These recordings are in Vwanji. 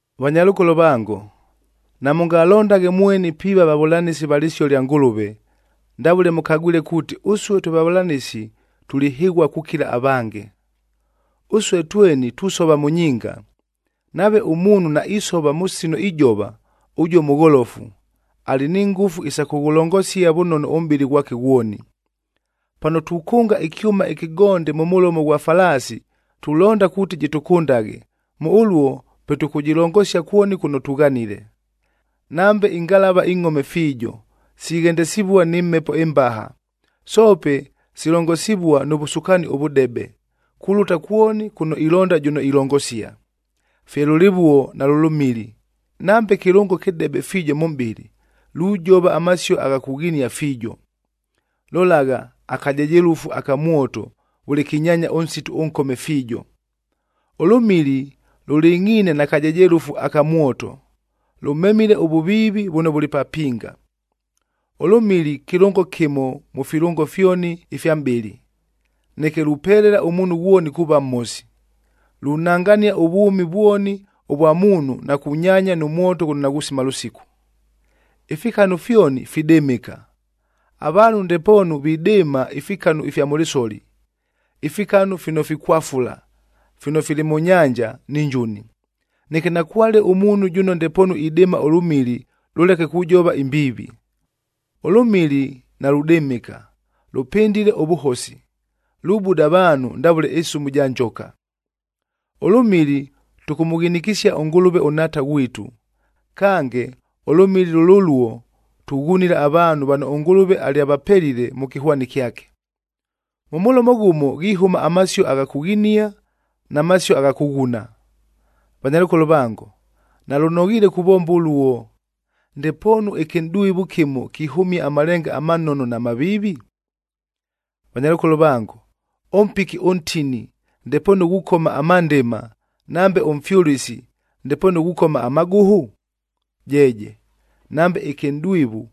Vanyalʉkolo vango, namʉngalondaghe mweni piiva vavʉlanɨsi va lɨsio lya Ngʉlʉve, ndavʉle mʉkagwile kuuti ʉsue twe vavʉlanɨsi tulihɨghua kukila avange. Ʉsue tweni tusova mʉ nyinga. Nave ʉmuunhu naisova mʉ sino ijova, ʉjuo mʉgholofu, alɨ ni ngʉfu isa kʉghʉlongosia vʉnono ʉmʼbɨlɨ ghwake ghwoni. Pano tukʉnga ɨkyʉma ɨkɨgonde mʉ mʉlomo ghwa falaasi tulonda kuuti jɨtʉkʉndaghe, mʉ ʉluo pe tʉkʉjɨlongosia kwoni kʉno tughanile. Nambe ingalavaa ingʼhome fiijo, sighendesivua nɨ mhepo ɨmbaha, soope silongosivua nʉ vʉsukaani ʉvʉdebe, kulʉta kwoni kʉno ilonda jʉno ilongosia. Fye lʉlɨvuo nalʉ lʉmili, nambe kɨlʉngo kɨdebe fiijo mʉ mʼbɨlɨ, lujova amasio agha kughinia fiijo. Lolagha, akajejelʉfu aka mwoto vʉle kinyaanya ʉnsitu ʉnkome fiijo. Ʉlʉmili lʉlɨngʼhiine na kajejelʉfu aka mwoto, lʉmemile ʉvʉviivi vʉno vʉlɨ papinga. Ʉlʉmili kɨlʉngo kɨmo mʉ filʉngo fyoni ifya mʼbɨlɨ, neke lupelela ʉmuunhu ghwoni kuuva mhosi. Lunangania ʉvwʉmi vwoni ʉvwa muunhu na kunyaanya nʉ mwoto ghʉno naghusima lʉsiku. Ifikanu fyoni, fidɨmɨka. Avaanhu ndepoonu vidɨɨma ifikanu ifya mʉ lɨsoli, ifikanu fino fikwafula, fino fili mʉ nyanja ni njuni. Neke nakwale ʉmuunhu jʉno ndepoonu idɨɨma ʉlʉmili lʉleke kujova imbiivi. Ʉlʉmili naludɨmɨka, lʉpɨndile ʉvʉhosi, lubuda avaanhu ndavʉle ɨsumu ja njoka. Ʉlʉmili tʉkʉmʉghinikisia ʉNgʉlʉve ʉNhaata ghwitu. Kange, ʉlʉmili lʉlʉluo tughunila avaanhu vano ʉNgʉlʉve alyavapelile mʉ kɨhwani kyake. Mʉ mʉlomo ghʉmo ghihʉma amasio agha kughinia na masio agha kʉghuna. Vanyalʉkolo vango, nalʉnoghiile kuvomba ʉluo! Ndepoonu ɨkɨnʼdwivu kɨmo kihʉmia amalenga amanono na maviivi? Vanyalʉkolo vango, ʉmpiki ʉntini ndepoonu ghukoma amandɨma, nambe ʉmfyʉlɨsi ndepoonu ghukoma amagʉhʉ? Jeeje, nambe ɨkɨnʼdwivu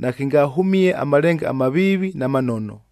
nakɨngahʉmie amalenga amaviivi na manono.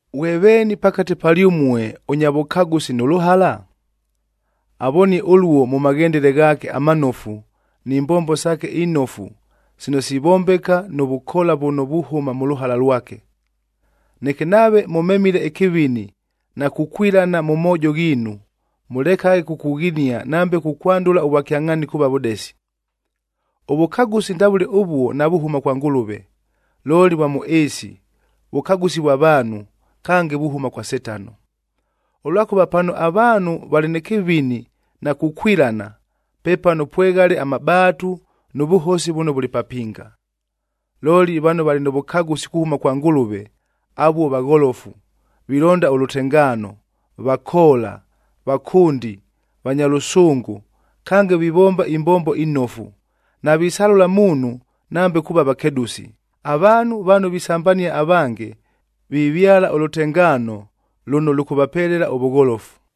Ghwe veeni pakate palyʉmue, ʉnya vʉkagʉsi nʉ lʉhala? Avonie ʉluo mʉ maghendele ghaake amanofu ni mbombo saake inofu sino sivombeka nʉ vʉkoola vʉno vuhʉma mʉ lʉhala lwake. Neke nave mʉmemile ɨkɨvini na kukwilana mʉ moojo ghiinu, mʉlekaghe kukughinia nambe kukwandʉla ʉvwakyangʼhaani kuuva vʉdesi. Ʉvʉkagʉsi ndavʉle ʉvuo navuhʉma kwa Ngʉlʉve, looli vwa mʉ ɨɨsi, vʉkagʉsi vwa vaanhu, kange vuhʉma kwa Setano. Ʉlwakʉva pano avaanhu valɨ nɨ kɨvini na kukwilana, pepano pweghale amabaatu nʉ vʉhosi vʉno vʉlɨ papinga. Looli, vano valɨ nʉ vʉkagʉsi kuhʉma kwa Ngʉlʉve, avuo vagholofu, vilonda ʉlʉtengaano, vakoola, vakʉndi, vanya lʉsʉngʉ, kange vivomba imbombo inofu, navisalʉla muunhu nambe kuuva vakedʉsi. Avaanhu vano visambania avange, vivyala ʉlʉtengaano lʉno lʉkʉvapelela ʉvʉgholofu.